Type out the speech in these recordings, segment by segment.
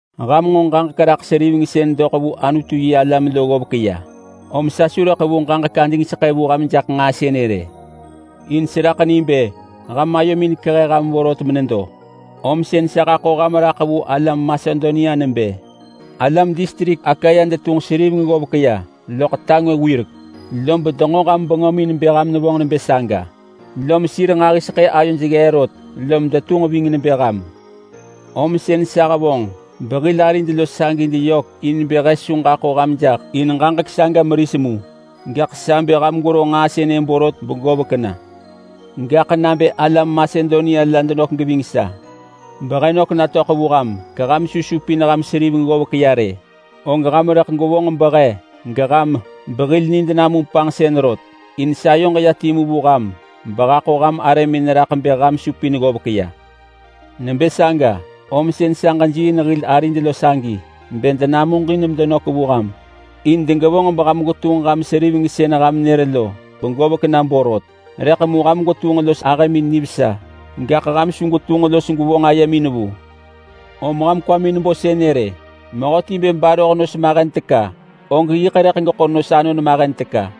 Ham nġo ġaġek raḳ seriveng sën doḳ vu Anutu-yi-alam lo ggovek ya, om sa su rëḳ ḳevu ġaġek adingseḳë vu ham jaḳ nġaa sënë rë. In seraḳ ni bë ham ayomin kehe ham vorot menedo, om sën sa haḳo ham raḳ vu alam Masedonia nebë, “Alam distrik Akaya detunġ seriveng ggovek ya loḳ ta ngwë wirek.” Lob denġo ham bengömin bë ham nevonġ nebë saga, lom sir nġahiseḳë ayoj ggee rot, lom detunġ ving nebë ham. Om sën sa hevonġ behil arid lo sagi deyök in bë he su ġaḳo ham jaḳ in ġaġek saga meris mu, gaḳ sa bë ham gwero nġaa sënë borot begovek na. Gaḳ nabë alam Masedonia la denök geving sa behe nök natöḳ vu ham geham su supin ham seriveng ggovek ya rë, og ham rëḳ gwevonġ behe, geham, behil nid namum panġsën rot. In sayoġ ya timu vu ham behaḳo ham arëmin raḳ bë ham supin ggovek ya. Nebë saga, om sën sa ġejiiin hil arid lo sagi bë denamuġin medenök vu ham in degevonġ beham gwetunġ ham seriveng sën ham nër lo begovek na borot. Rëḳ mu ham gwetunġ los ahëmin nivesa, gaḳ ham su gwetunġ los gwevonġ ayemin vu. Om ham kwamin bo sënë rë: Mehöti bë baroh nos mahen teka, og yiḳ rëḳ geḳo nos anon mahen teka.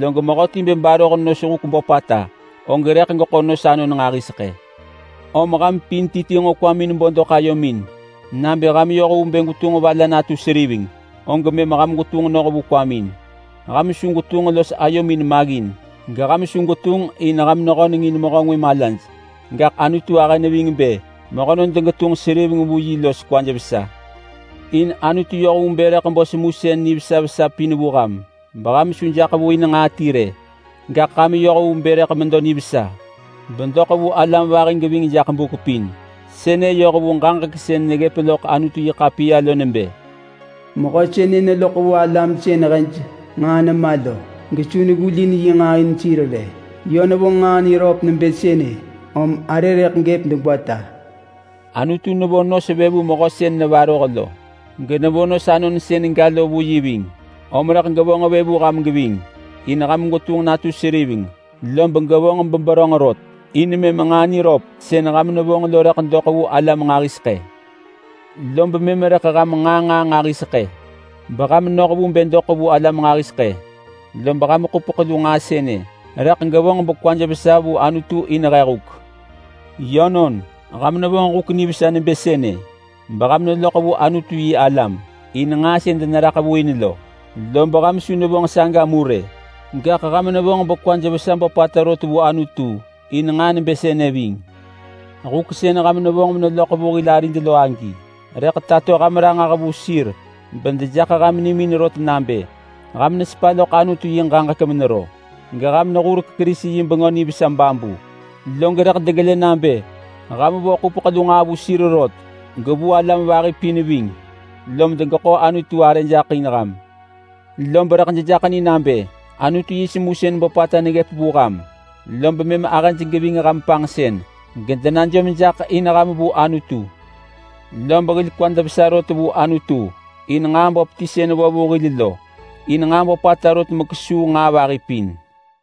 Log mehöti bë baroh nos huk böpata, og rëḳ geḳo nos anon nġahiseḳë. Om ham pin ti ti nġo kwamin bo doḳ ayomin nabë ham neyoh vu bë gwetunġ va la natu seriveng, og mëm ham gwetunġ noh vu saga. Ham su gwetunġ los ayomin maggin, geham su gwetunġ in ham nehöneng in mehö ngwë malaj. Gaḳ Anutu ahë neving bë mehönon degetunġ seriveng vu yi los kwaj vesa. In Anutu yoh vu bë rëḳ bo semusën nivesa vesa pin vu ham, beham su jaḳ vu in nġaa ti rë, gaḳ ham yoh vu bë rëḳ medo nivesa bedoḳ vu alam vahi geving jaḳ buk pin. Sënë yoh vu ġaġek sën neggëp loḳ Anutu-yi-ḳapiya lo nebë: “Mehö sënë neloḳ vu alam sën hej nġaa nema lo gesu neggulin yi nġaa in sir rë. Yö nevonġ nġaa niröp nebë sënë, om arë rëḳ gëp degwata.” Anutu nevo nos vë vu mehö sën nevaroh lo, genevo nos anon sën ga lo vu yi ving. Om rëḳ gevonġ vë vu ham geving in ham gwetunġ natu seriveng, lob gevonġ beberönġ rot. In mëm nġaa niröp sën ham nevonġ lo rëḳ doḳ vu alam nġahiseḳë. Lob mëm rëḳ ham nġaa nġaa nġahiseḳë beham noh vu bë doḳ vu alam nġahiseḳë. Lob ham ḳupeḳ lu nġaa sënë rëḳ gevonġ bekwaj vesa vu Anutu in he huk. Yönon, ham nevonġ huk nivesa nebë sënë beham neloḳ vu Anutu-yi-alam in nġaa sën deneraḳ vu in lo. Lob ham su nevonġ saga mu rë, gaḳ ham nevonġ bekwaj vesa böpata rot vu Anutu in nġaa nebë sënë ving. Huk sën ham nevonġ meneloḳ vu hil arid lo agi rëḳ tato ham ranġah vu sir bedejaḳ ham nimin rot nabë: Ham nesepa loḳ Anutu yi ġaġek menero geham nehurek Kerisi yi Bengö Nivesa babu. Log rëḳ degelë nabë ham vo ḳupeḳ lu nġaa vu sir rot, gevu alam vahi pin ving, lom degeḳo Anutu arë jaḳ in ham. Lob rëḳ dejaḳ ni nabë Anutu yi semusën böpata neggëp vu ham, lob mëm ahëj geving ham panġsën gedenajom jaḳ in ham vu Anutu. Lob hil kwad vesa rot vu Anutu in nġaa böp ti sën vo vu hil lo, in nġaa böpata rot mekesuu nġaa vahi pin.